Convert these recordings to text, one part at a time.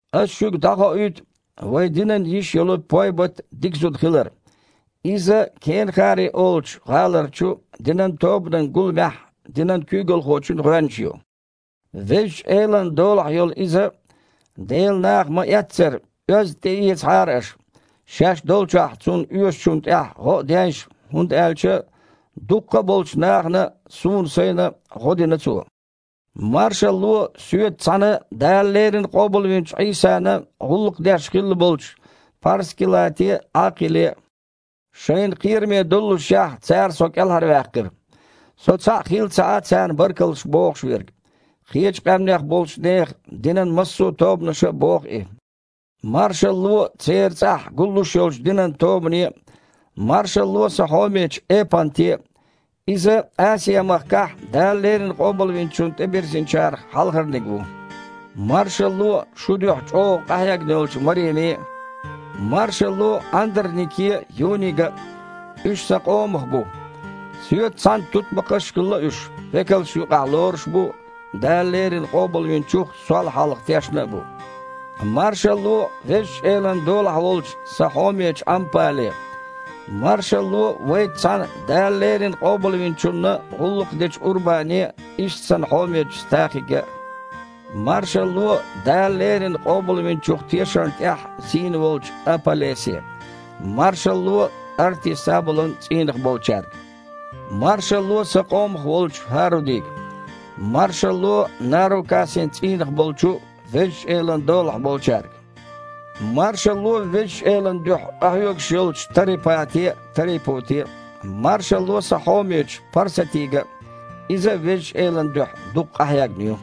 Аса шуьга дІахоуьйту, вайн динан йиша йолу Пойбат дика зуда хилар. Иза Кенахари олучу гІаларчу динан тобанан гуламехь динан куьйгалхочун гІоьнча ю. Везачу Элан долахь йолу иза, Делан наха ма-эццара, оьзда тІеэцахьара аша. Шаьш долчохь цунна оьшучунна тІехь гІо а дейша, хІунда аьлча дуккха а болчу нахана а, суна-сайна а гІо дина цо. Маршалла ло соьца цхьаьна Дала леррина къобалвинчу Іийсана гІуллакх деш хилла болчу ПхьаьрскІилате а, Іакхиле а. Шайна кхераме доллушехь, цара со кІелхьарваьккхира. Со цхьаъ хилла ца Іа царна баркаллаш бохуш верг, кхечу къаьмнех болчу нехан динан массо а тобанаша а боху и. Маршалла ло церан цІахь гуллуш йолчу динан тобане а. Маршалла ло сан хьомечу Эпанте а. Иза Асиа-махкахь Дала леррина Къобалвинчунна тІебирзинчарах хьалхарниг ву. Маршалла ло шун дуьхьа чІогІа къахьегна йолчу Мареме а. Маршалла ло Іандарнике а, Юнига а. Уьш сан къомах бу. Соьца цхьаьна тутмакхаш а хилла уьш, векалшна юкъахь лоруш а бу, Дала леррина Къобалвинчух сол а хьалха тешна а бу. Маршалла ло Везачу Элан долахь волчу сан хьомечу Іампале. Маршалла ло вайца цхьаьна Дала леррина Къобалвинчунна гІуллакх дечу Урбане а, иштта сан хьомечу Стахига а. Маршалла ло Дала леррина Къобалвинчух тешарна тІехь зийна волчу Апа-Лесе. Маршалла ло Арти-Сабулан цІийнах болчаьрга. Маршалла ло сан къомах волчу ХІарудига. Маршалла ло Нару-Касин цІийнах болчу Везачу Элан долахь болчаьрга. Маршалла ло Везачу Элан дуьхьа къахьоьгуш йолчу Тарипате а, Тарипуте а. Маршалла ло сан хьомечу Парсатига а. Иза а Везачу Элан дуьхьа дукха къахьегна ю.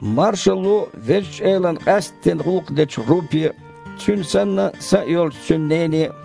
Маршалла ло Везачу Элана къаьсттина гІуллакх дечу Рупе а, цуьнан санна, сан а йолчу цуьнан нене а.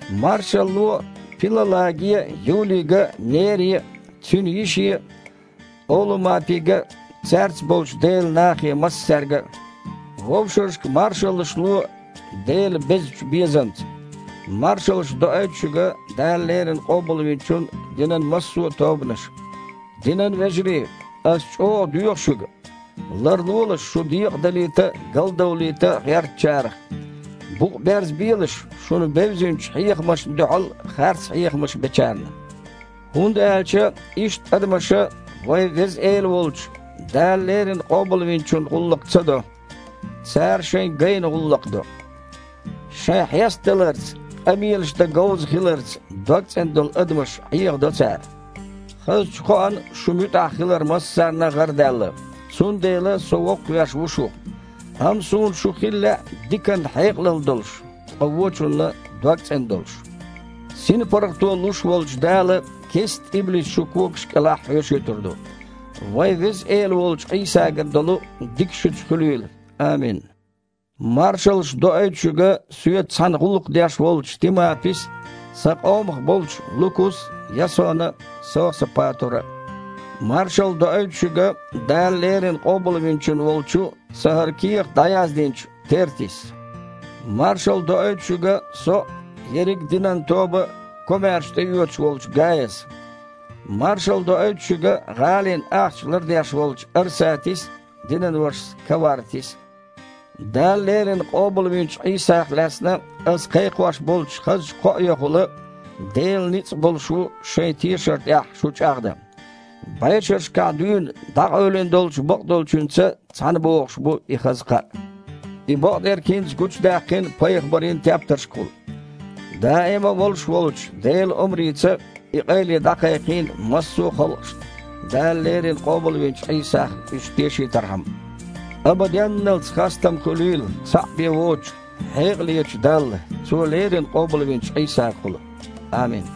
Маршалла ло Пилалаге а, Юлига а, Нере а, цуьнан йише а, Олу-Мапига а, цаьрца болчу Делан нахе массаьрга а. Вовшашка маршаллаш ло Делан безачу безамца. Маршаллаш доуьйту шуьга Дала леррина Къобалвинчун динан массо а тобанаша. Динан вежарий, аса чІогІа доьху шуьга, ларлолаш шу декъадалийта а, галдовлийта а гІертачарех. Букъ берзабелаш шуна бевзинчу хьехамашна дуьхьал харц хьехамаш бечарна. ХІунда аьлча иштта адамаша вайн Веза Эла волчу, Дала леррина Къобалвинчунна гІуллакх ца до. Цара шайн гайна гІуллакх до. Шайн хьестадаларца, къамелаш дан говза хиларца догцІена долу адамаш Іехадо цара. Хазачу кхоана шун муьтІахь хилар массарна а гІарадаьлла, цундела со воккхавеш ву шух. Амма суна шу хила лаьа диканна – хьекъалалла долуш, ткъа вочунна – догцІена долуш. СинпаргІато луш волчу Дала кестта иблис шун когашна кІелахь хьоьшуьйтур ду. Вайн Веза Эла волчу Іийсагара долу дика шуьца хуьлийла! Амин. Маршаллаш доуьйту шуьга соьца цхьаьна гІуллакх деш волчу Тимапис а, сан къомах болчу Лукус а, Ясона а, Соса-Патура а. Маршалла доуьйту шуьга Дала леррина Къобалвинчун волчу сан хІара кехат дІаяздинчу Тертис. Маршалла доуьйту шуьга со а, ерриг а динан тоба а комаьрша тІеоьцуш волчу Гаяса. Маршалла доуьйту шуьга гІалин ахча лардеш волчу Арсатис а, динан вашас Кавартис а. Дала леррина къобалвинчу Іийсах лаьцна Ас кхайкхош болчу хазачу кхоэхула Дела ницкъ болуш ву шайн тешар тІехь шу чІагІдан. БІешерашкахь дуьйна дІакъевлина долчу бакъдолчуьнца цхьаьнабогІуш бу и хаза кхаъ. И бакъдерг хІинца гучудаьккхина пайхамарийн тептаршкахула. Даима а волуш волчу Делан омрица и къайле дІакхайкхийна массо а халкъашна, Дала леррина къобалвинчу Іийсах уьш тешийтархьама. Абаденналц хастам хуьлийла цхьаъ бен воцучу, хьекъалечу Далла Цо леррина къобалвинчу Іийсагахула! Амин.